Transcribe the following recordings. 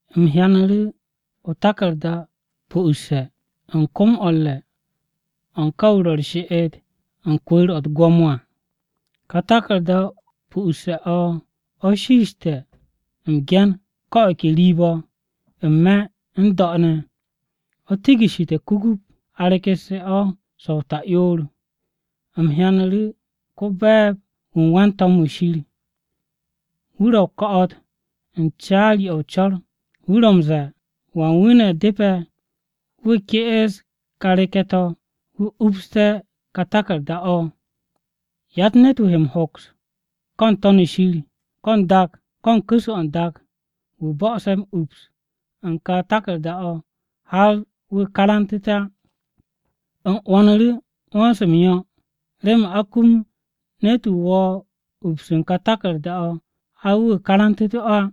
U̱m hyanu̱ru̱ o-taku̱rda pu'usse̱ u̱n kom-o̱ u̱r-re̱ o̱ u̱n ka wu̱ ro̱ u̱r-she'et u̱n kwu̱u̱r-o̱ u̱t-gwo̱mo à. Ka taku̱rda-o pu'usse̱ o̱ shiishte̱ m-ge̱n ko̱ o̱ ke riib-o̱, n-me̱ n-do̱ ne̱, o̱ tigishshite̱ kugup a rekesse̱ o̱ so̱-o ta'yoor. U̱m hyanu̱ru̱ ko-be̱e̱b-wu̱ u̱n wan-to̱m-wu̱ Shir, wu̱ ro̱ o-ko̱'o̱t u̱n caari-o̱ o-co̱r wu̱ ro̱ m-ze̱e̱, “¿Wan wu̱ ne̱ depe̱ wu̱ ke'es ká reke̱-to̱ wu̱ upste̱ ka taku̱rda-o̱?” Yatt ne̱t-wu̱ he m-hoks ko̱ n-To̱n shir, ko̱ n-dak, ko̱ u̱n ku̱s-o̱ n-dak wu̱ bo̱'o̱se̱ ups u̱n ka taku̱rda-o̱, har wu̱ karantu̱te̱ á. U̱m 'wo̱nu̱ru̱ 'wo̱n-se m-yo̱ remen a kum ne̱t-wu̱ wo̱o̱ ups u̱n ka taku̱rda-o̱ har wu̱ karantu̱tu̱ o̱ á.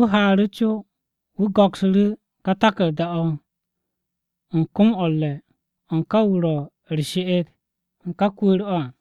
Wu̱ haaru̱ co wu̱ go̱ksu̱ru̱ ká taku̱rda-o̱ u̱n kom-o̱ u̱r-re̱ o̱ u̱n ká wu̱ ro̱ u̱r-she'et u̱n ká kwu̱u̱r-o̱ à.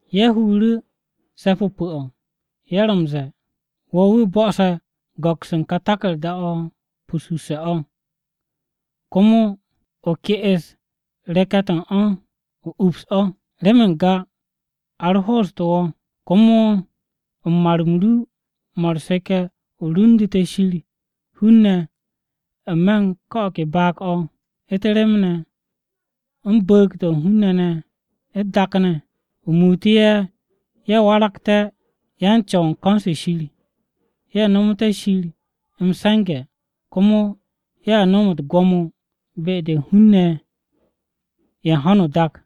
Ye̱ huru̱ se̱p-o pu̱-o̱, ye̱ ro̱ m-ze̱e̱: “Wo̱ wu̱ bo̱'o̱se̱ go̱ks u̱n kà taku̱rda-o pu'usse̱-o̱ komo o ke'es reke̱-to̱ u̱n o̱ o ups o̱. Remen n-ga a ro hoostu̱ wo̱, komo u̱n mar-m ru mo̱ u̱r-seke̱ o rundu̱te̱ Shir hun-ne̱ n-me̱ u̱n ko̱ o̱ ke baag-o̱, u̱t-rem ne̱, u̱n bu̱u̱g-to̱ u̱n hun-ne̱ ne̱ u̱t-dak ne̱. O muutu̱ ye̱, ye̱ waragté̱ yan-Co̱w u̱n ko̱n-se Shir, ye̱ nomoté̱ Shir m-se̱nge̱, komo ye̱a nom u̱t-gwo̱mo be-de u̱n hun-ne̱ ye̱ u̱n ho̱no o-dak.”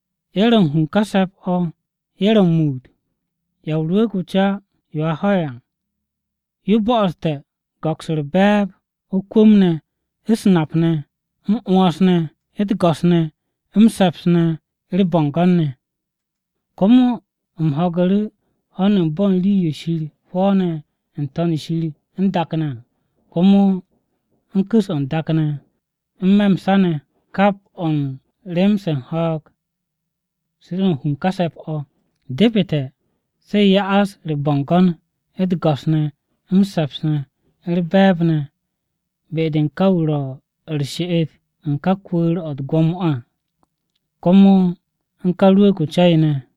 Ye̱ ro̱ u̱n hu u̱n ká se̱p-o̱ ye̱ ro̱ m-muut: “Ya o-Rwu̱u̱g o-Ca yo a ho̱e̱ à, yo bo̱'o̱ste̱ go̱ks u̱r-be̱e̱b, o-kwu̱m ne̱, u̱s-nap ne̱, m-'wo̱ns ne̱, u̱t-go̱s ne̱, m-se̱ps ne̱, u̱r-bo̱ngo̱n ne̱!” Komo u̱m ho̱gu̱ru̱ ho̱n u̱n bo̱ u̱n rii-yo Shir hwo̱o̱ne̱ n-To̱n shir n-dak ne̱ à, komo u̱n ku̱s-o̱ n-dak ne̱, n-me̱ m-sa ne̱. Kap o̱ u̱n rem-se u̱n ho̱o̱g se ro̱ u̱n hu u̱n ká se̱p-o̱: “Depete̱ se ya'as u̱r-bo̱ngo̱n, u̱t-go̱s ne̱, m-se̱ps ne̱, u̱r-be̱e̱b ne̱, be-de u̱n ká wu̱ ro̱ u̱r-she'et u̱n ká kwu̱u̱r-o u̱t-gwo̱mo o̱ à, komo u̱n ká Rwu̱u̱g-o o-Ca yo ne̱,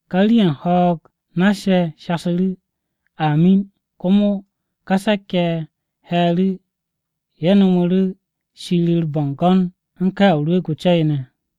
Ká rii-ye̱ u̱n ho̱o̱g nass-ye̱ shasu̱ru̱, “Amin!” Komo ká se̱k-ye̱ ye̱ he̱e̱ru̱, ye̱ no̱mu̱ru̱ Shir u̱r-bo̱ngo̱n u̱n ká Ya Rwu̱u̱g-o Ca-yo ne̱.